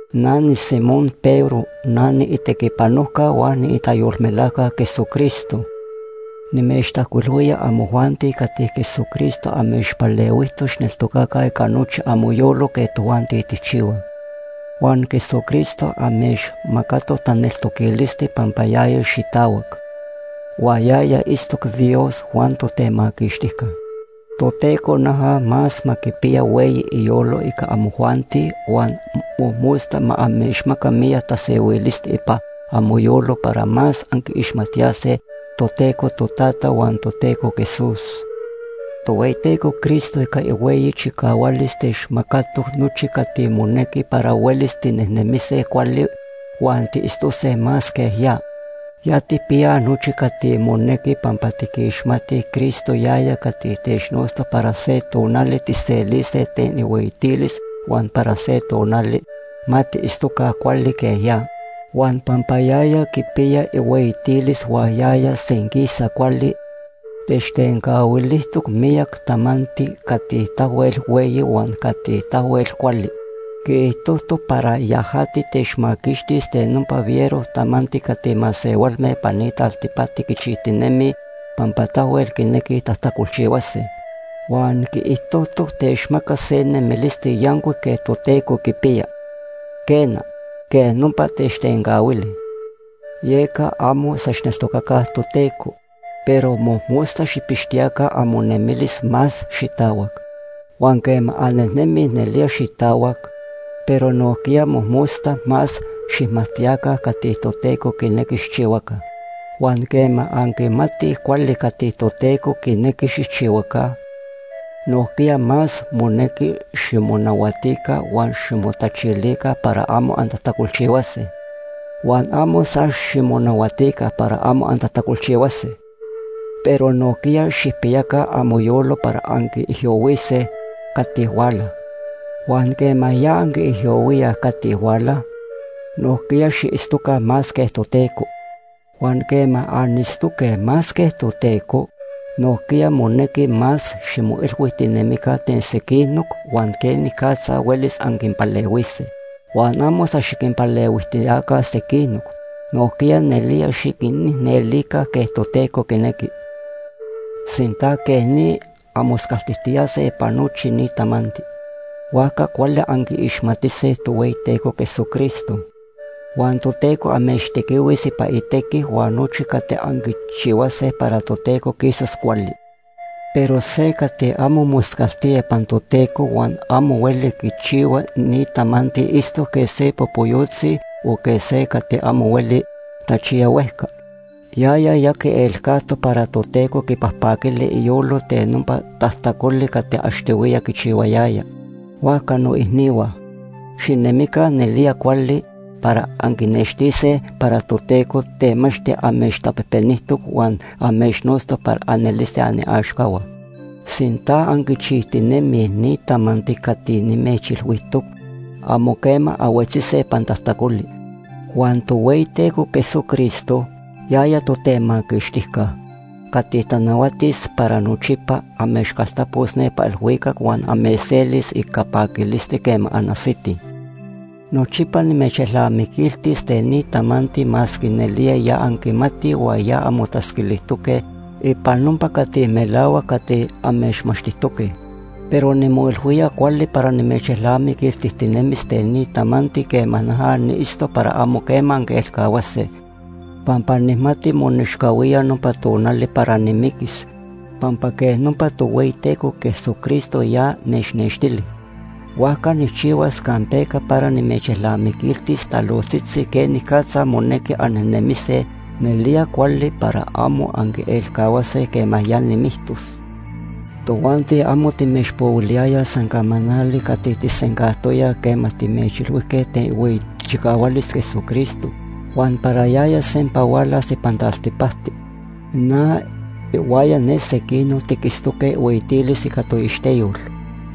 Na niSimón Pedro. Na niitequipanojca huan niitayolmelajca Jesucristo. Nimechtajcuilhuía amojuanti cati Jesucristo amechpalehuijtoc xijneltocaca ica nochi amoyolo quej tojuanti tijchihuaj. Huan Jesucristo amechmacatoc taneltoquilisti pampa yaya xitahuac, huan yaya itztoc Dios huan Totemaquixtijca. Toteco noja más ma quipiya hueyi iyolo ica amojuanti huan mojmosta ma amechmaca miyac tasehuilisti ipan amoyolo para más anquiixmajtiyase Toteco Totata huan Toteco Jesús. Tohueyiteco Cristo ica ihueyi chicahualis techmacatoc nochi cati monequi para huelis tinejnemise cuali huan tiitztose más quej ya. Ya tijpiyaj nochi cati monequi pampa tiquixmatij Cristo, yaya cati technotztoc para se tonali tijselise ten ihueyitilis huan para se tonali ma tiitztoca cuali quej ya. Huan pampa yaya quipiya ihueyitilis huan yaya senquisa cuali, techtencahuilijtoc miyac tamanti cati tahuel hueyi huan cati tahuel cuali. Quiijtojtoc para yajati techmaquixtis ten nopa fiero tamanti cati masehualme ipan ni taltipacti quichijtinemij pampa tahuel quinequij tajtacolchihuase. Huan quiijtojtoc techmacas se nemilisti yancuic quej Toteco quipiya. Quena, quej nopa techtencahuili. Yeca amo san xijneltocaca Toteco, pero mojmosta xijpixtiyaca amonemilis más xitahuac. Huan quema annemij nelía xitahuac, pero nojquiya mojmosta más xijmajtiyaca cati Toteco quinequi xijchihuaca. Huan quema anquimatij cuali cati Toteco quinequi xijchihuaca, nojquiya más monequi ximonahuatica huan ximotachilica para amo antajtacolchihuase. Huan amo san ximonahuatica para amo antajtacolchihuase, pero nojquiya xijpiyaca amoyolo para anquiijyohuise cati huala. Huan quema ya anquiijyohuíaj cati huala, nojquiya xiitztoca más quej Toteco. Huan quema anitztoque más quej Toteco, nojquiya monequi más ximoilhuijtinemica ten sequinoc huan quenicatza huelis anquinpalehuise. Huan amo san xiquinpalehuijtiyaca sequinoc, nojquiya nelía xiquinicnelica quej Toteco quinequi. Sinta quej ni anmoscaltijtiyase ipan nochi ni tamanti, huajca cuali anquiixmatise Tohueyiteco Jesucristo. Huan Toteco amechtequihuis ipan itequi huan nochi cati anquichihuase para Toteco quisas cuali. Pero se cati amo moscaltía ipan Toteco huan amo hueli quichihua ni tamanti itztoc quej se popoyotzi o quej se cati amo hueli tachiya huejca. Yaya ya quielcajtoc para Toteco quipajpaquili iyolo ten nopa tajtacoli cati achtohuiya quichihuayaya. Huajca noicnihua, xinemica nelía cuali para anquinextise para Toteco temachti amechtapejpenijtoc huan amechnotztoc para anelise aniaxcahua. Sinta anquichijtinemij ni tamanti cati nimechilhuijtoc, amo quema anhuetzise ipan tajtacoli. Huan Tohueyiteco Jesucristo, yaya Totemaquixtijca, cati tanahuatis para nochipa, amechcaltapos nepa ilhuicac huan amechselis ica paquilisti quema anajsitij. Nochipa nimechelnamiquiltis ten ni tamanti masque nelía ya anquimatij huan ya anmotatzquilijtoque ipan nopa cati melahuac cati amechmachtijtoque. Pero nimoilhuía cuali para nimechelnamiquiltijtinemis ten ni tamanti quema noja niitztos para amo quema anquielcahuase. Pampa nijmati monechcahuía nopa tonali para nimiquis pampa quej nopa Tohueyiteco Jesucristo ya nechnextili. Huajca nijchihuas campeca para nimechelnamiquiltis talojtzitzi quenicatza monequi annejnemise nelía cuali para amo anquielcahuase quema ya nimictos. Tojuanti amo timechpohuiliyayaj san camanali cati tijsencajtoyaj quema timechilhuijque ten ihueyi chicahualis Jesucristo huan para yaya sempa hualas ipan taltipacti. Na ihuaya ne sequinoc tiquitztoque ihueyitilis ica toixteyol.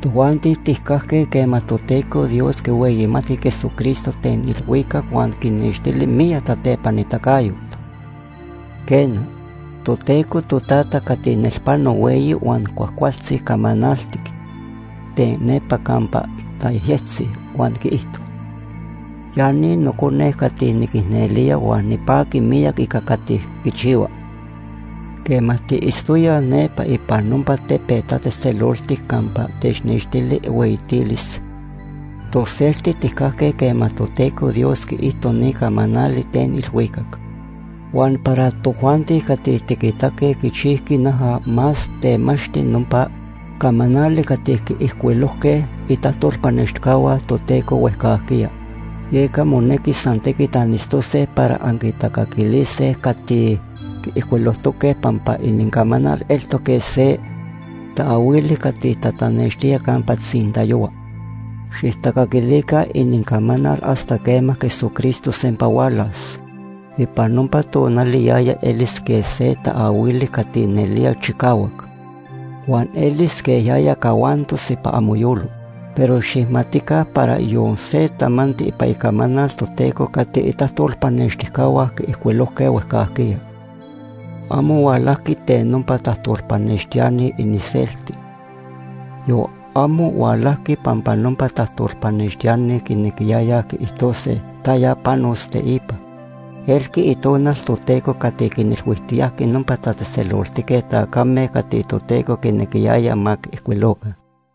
Tojuanti tijcajque quema Toteco Dios quihueyimatqui Jesucristo ten ilhuicac huan quinextili miyac tatepanitacayot. Quena, Toteco Totata cati nelpano hueyi huan cuajcualtzi camanaltic ten nepa campa tayejyectzi huan quiijto: “Ya ni Nocone cati niquicnelía huan nipaqui miyac ica cati quichihua.” Quema tiitztoyaj nepa ipan nopa tepet tatzejtzeloltic campa technextili ihueyitilis, toselti tijcajque quema Toteco Dios quiijto ni camanali ten ilhuicac. Huan para tojuanti cati tiquitaque, quichijqui noja más temachti nopa camanali cati quiijcuilojque itajtolpanextijcahua Toteco huejcajquiya. Yeca monequi san tequit anitztose para anquitacaquilise cati quiijcuilojtoque pampa inincamanal eltoc quej se taahuili cati tatanextía campa tzintayohua. Xijtacaquilica inincamanal hasta quema Jesucristo sempa hualas. Ipan nopa tonali yaya elis quej se taahuili cati nelía chicahuac, huan elis quej yaya cahuantos ipan amoyolo. Pero xijmatica para yon se tamanti ipan Icamanal Toteco cati itajtolpanextijcahua quiijcuilojque huejcajquiya, amo hualajqui ten nopa tajtolpanextiani iniselti, yon amo hualajqui pampa nopa tajtolpanextiani quinequiyayaj quiijtose taya panos teipa. Elqui Itonal Toteco cati quinilhuijtiyajqui nopa tatzejtzeloltique tacame cati Toteco quinequiyaya ma quiijcuiloca.